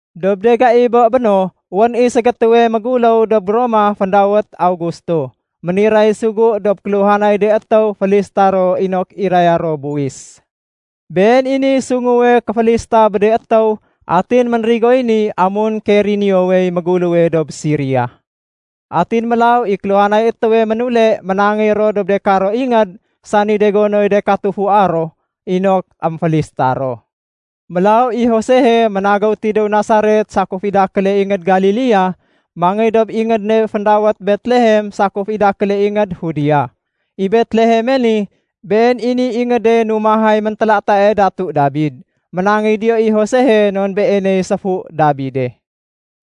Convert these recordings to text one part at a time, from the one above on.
Dob de gai bé béno, wén i ségétéwe méngguléw dob Roma féndawét Augusto. Méniray sugu dob kéluhanay de étéw félista ro inok iraya ro buwis. Been i niy sunguwe kéfélista bé de étéw, atin ménrigoy ni amun Kireniowey méguléwe dob Siria. Atin mélaw i kéluhanay étéwe ménule ménangéy dob de karo ingéd, sani de gonoy de katufua ro, inok émfélista ro. Mélaw i Josehe ménagéw tidéw Nasaret sakuf i dakéle ingéd Galilea, mangéy dob ingéd ne féndawét Betlehem sakuf i dakéle ingéd Judea. I Betleheme ni, been i niy ingéde numahay méntélatae Datu Dabid. Ménangéy diyo i Josehe non beeney séfu Dabide.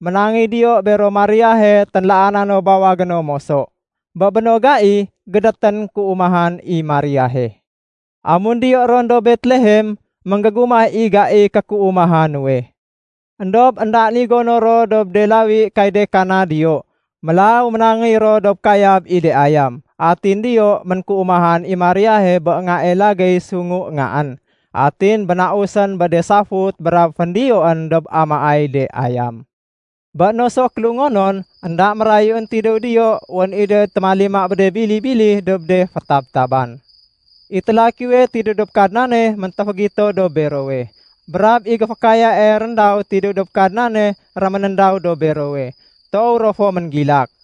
Ménangéy diyo bero Mariahe ténlaana no bawagé no moso. Bé béno gai, gédétén kéumahan i Mariahe. Amun diyo ron dob Betlehem, ménggégumah i gaiy kékéumaha nuwe. Endob éndaén i gono ro dob de lawi kay de kana diyo. Mélaw ménangéy ro dob kayab i de ayam. Atin diyo ménkéumahan i Mariahe bé ngae lagéy sungu ngaén. Atin bénausén bé de safut brab féndiyoén dob amaay de ayam. Bé no so kélungonon, énda mérayuén tidéw diyo wén i do témalima bé de bili-bili dob de fétabtaban. I télakiwe tidéw dob Kadnane méntéfégito dob berowe. Brab i géfékayae réndaw tidéw dob Kadnane réménéndaw dob berowe. Toow ro fo ménggilak.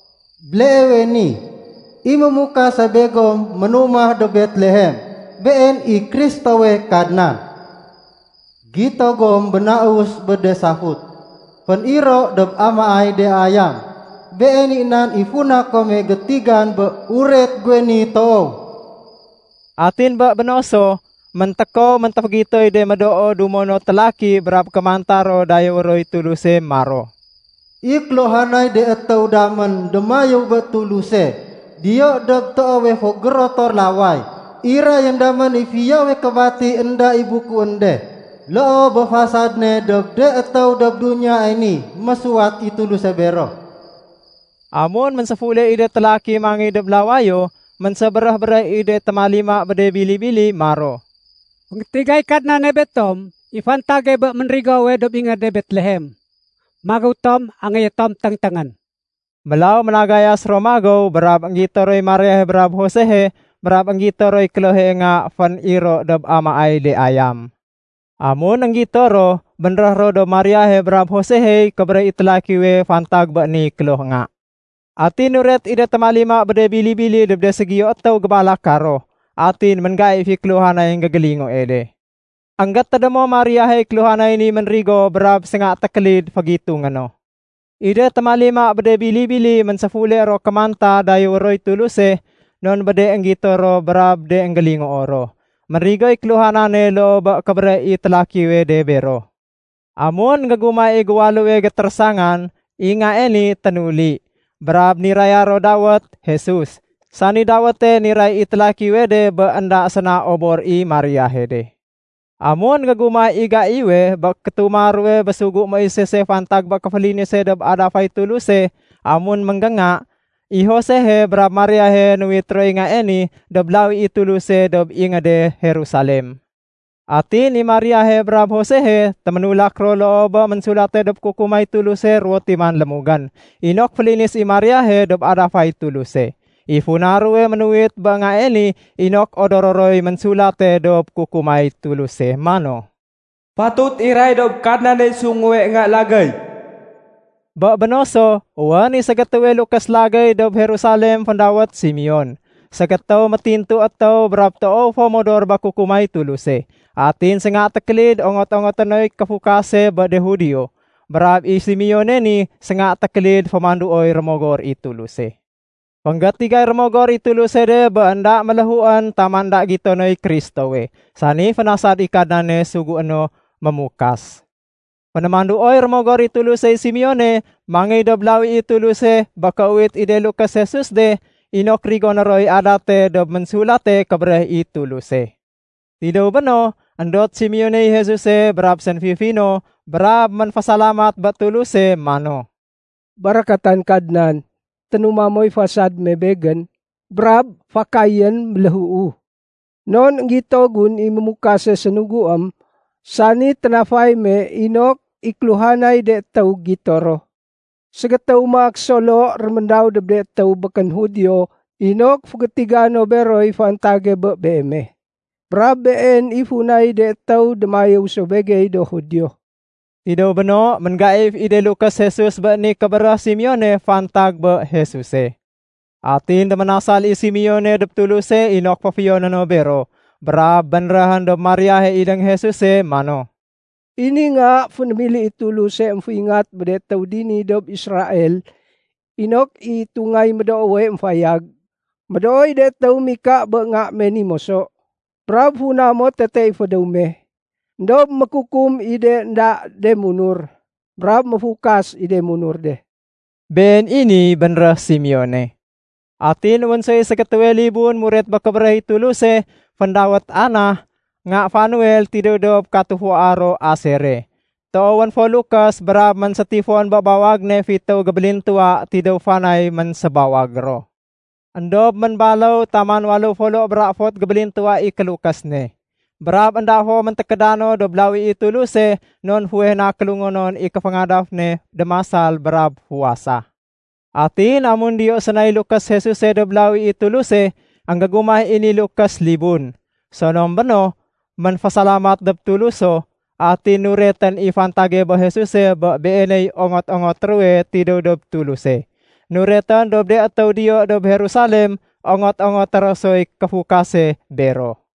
Béleewe ni, i Mémukase begom ménumah dob Betlehem. Been i Kristowe Kadnan. Gito gom bénaus bé de safut, fén-iro dob amaay de ayam. Been i nan i funa kome gétigan bé uret guwe ni toow.” Atin bé béno so, méntékow méntéfégitoy de médoo dumo no télaki brab kémanta ro dayéwé roy Tuluse maro, “I kéluhanay de étéw damén démayéw bé Tuluse diyo dob toowe fo gérotor laway. Irayén damén i fiyowe kébati énda i bukuén de, loo bé fasad ne dob de étéw dob duniyae ni mésuwat i Tuluse bero.” Amun ménséfule i de télaki mangéy dob lawayo, ménsébéréh-béréh i de témalima bé de bili-bili maro, “Fénggétigay Kadnane betom i fantage bé ménrigowe dob ingéde Betlehem. Magéw tom angéyé tom téngténgén.” Mélaw ménagayas ro magéw brab énggito roy Mariahe brab Josehe brab énggito roy klohe nga fén-iro dob amaay de ayam. Amun énggito ro, bénréh ro dob Mariahe brab Josehey kébéréh i télakiwe fantag bé ni kloh nga. Atin nuret i de témalima bé de bili-bili dob de ségiyo étéw gébalaka ro, atin ménggaif i kéluhanay énggégélingoe de. Enggétédémo Mariahey kéluhanay ni ménrigo brab sénga tékélid fégitungé no. I de témalima bé de bili-bili ménséfule ro kémanta dayéwé roy Tuluse, non bé de énggito ro brab de énggélingoo ro. Ménrigoy kéluhanane loo bé kébéréh i télakiwe de bero. Amun énggégumah i géwaléwe gétérésangan, i ngae ni ténuli, brab niraya ro dawét Jesus, sani dawéte niray i télakiwe de bé énda séna obor i Mariahe de. Amun énggégumah i gaiwe bé kétuma ruwe bé sugu Moisese fantag bé kéfélinise dob adafay Tuluse amun mégénga, i Josehe brab Mariahe nuwit roy ngae ni dob lawi i Tuluse dob ingéde Jerusalem. Atin i Mariahe brab Josehe téménulak ro loo bé ménsulate dob Kukumay Tuluse ruwo timan lémugén inok félinis i Mariahe dob adafay Tuluse. I funa ruwe ménuwit bé ngae ni inok odoro roy ménsulate dob Kukumay Tuluse mano, “Fatut iray dob Kadnaney sunguwe nga lagéy.” Bé béno so, wén i ségétéwe lukés lagéy dob Jerusalem féndawét Simeon. Ségétéw métintu étéw brab toow fo modor bé kukumay Tuluse. Atin sénga tékélid ongot-ongoté noy kéfukase bé de Judio. Brab i Simeone ni sénga tékélid fémanduoy Rémogor i Tuluse. Fénggétigay Rémogor i Tuluse de bé énda méléhuén taman énda gito noy Kristowe, sani fénasad i Kadnane sugué no Mémukas. Fénémanduoy Rémogor i Tulusey Simeone mangéy dob lawi i Tuluse bé kéuwit i de lukés Jesus de inok rigoné roy adate dob Ménsulate Kébéréh i Tuluse. Tidéw béno, éndot Simeoney Jesuse brab sénfifi no brab ménfésalamat bé Tuluse mano, “Barakatan Kadnan, ténuma moy fasad me begén, brab fakayén méléhuu. Non énggito gun i Mémukase sénuguém, sani ténafay me inok i kéluhanay de étéw gito ro. Ségétéw maak solo réméndaw dob de étéw békén Judio inok fégétiga no beroy fantag bé Beeme. Brab Been i funay de étéw démayéw so begey do Judio.” Tidéw béno, ménggaif i de lukés Jesus bé ni kébéréh Simeone fantag bé Jesuse. Atin déménasal i Simeone dob Tuluse inok féfiyoné no bero, brab bénréhén dob Mariahe idéng Jesuse mano, “I ni nga fénémili i Tuluse émféingat bé de étéw dini dob Israel inok i itungay médoowe émfayag. Médooy de étéw mika bé nga me ni moso, brab funa mo tete i fédéw me. Endob mékukum i de énda de munur, brab méfukas i de munur de.” Been i niy bénréh Simeone. Atin wén soy ségétéwe libun muret bé kébéréh i Tuluse, féndawét Anah, nga Fanuel tidéw dob katufua ro Asere. Toowén fo lukés brab ménsétifon bé bawag ne fitéw gébélintuwa tidéw fanay ménsébawag ro. Endob ménbaléw taman waléw folo bra éfot gébélintuwa i kélukés ne. Brab énda fo méntékéda no dob lawi i Tuluse non fuweh na kélungonon i kéféngadaf ne démasal brab fuwasa. Atin amun diyo sénay lukés Jesuse dob lawi i Tuluse, énggégumah i ni lukés libun. Sonom béno, ménfésalamat dob Tuluso, atin nuretén i fantage bé Jesuse bé Beeney ongot-ongoté ruwe tidéw dob Tuluse. Nuretén dob de étéw diyo dob Jerusalem ongot-ongoté ro soy kéfukase bero.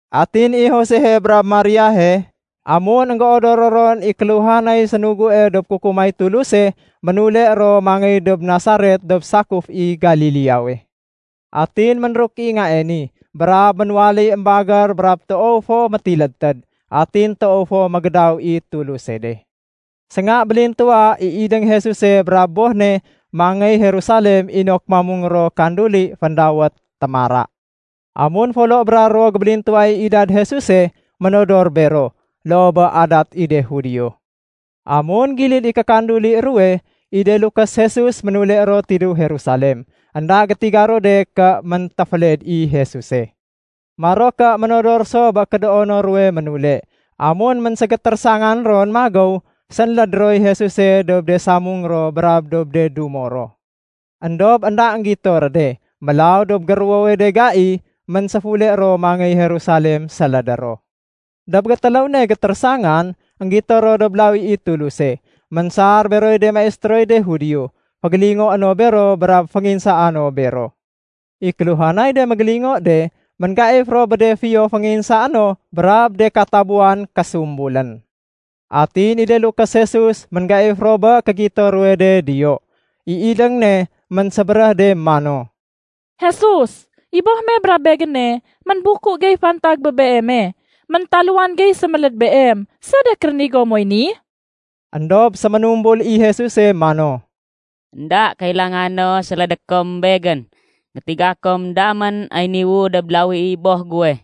Atin i Josehe brab Mariahe, amun énggéodoro ron i kéluhanay sénugue dob Kukumay Tuluse, ménule ro mangéy dob Nasaret dob sakuf i Galileawe. Atin ménruk i ngae ni, brab ménwaléy émbagér brab toow fo métilédtéd. Atin toow fo mégédaw i Tuluse de. Sénga bélintuwa i idéng Jesuse brab boh ne mangéy Jerusalem inok mamung ro kanduli féndawét “Témara”. Amun folo bra ruwo gébélintuwa i idad Jesuse, ménodor bero, loo bé adat i de Judio. Amun gilid i kékanduli ruwe, i de lukés Jesus ménule ro tidéw Jerusalem. Enda gétiga ro de ké méntéféled i Jesuse. Maro ké ménodor so bé kédoono ruwe ménule. Amun ménségétérésangan ron magéw, sénléd roy Jesuse dob de samung ro brab dob de dumo ro. Endob énda énggito ré de. Mélaw dob géruwowe de gai, ménséfule ro mangéy Jerusalem sélédé ro. Dob gétéléw ne gétérésangan, énggito ro dob lawi i Tuluse. Ménsar beroy de maistéroy de Judio, fégélingoé no bero brab fénginsaa no bero. I kéluhanay de mégélingo de, ménggaif ro bé de fiyo fénginsaé no brab de katabuwan késumbulén. Atin i de lukés Jesus ménggaif ro bé kégito ruwe de diyo. I idéng ne ménsébéréh de mano, “Jesus, i boh me brab begéne ménbuku gey fantag bé Beeme. Méntaluwan gey séméléd Beem. Sédék rénigo moy ni?” Endob séménumbul i Jesuse mano, “Enda kailanga no sélédé kom Begén. Gétiga kom damén ay niwu dob lawi i Boh guwe.”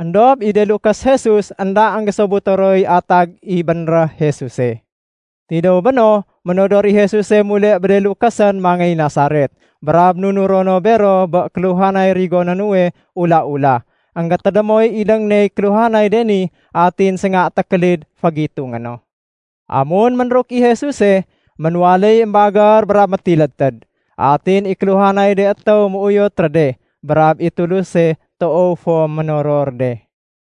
Endob i de lukés Jesus énda énggésobuto roy atag i bénréh Jesuse. Tidéw béno, ménodor i Jesuse mule bé de lukésén mangéy Nasaret, brab nunuro no bero bé kéluhanay rigoné nuwe ula-ula. Enggétédémoy idéng ney kéluhanay de ni, atin sénga tékélid fégitungé no. Amun ménruk i Jesuse, ménwaléy émbagér brab métilédtéd. Atin kéluhanay de étéw méuyot ré de, brab i Tuluse toow fo ménoror de.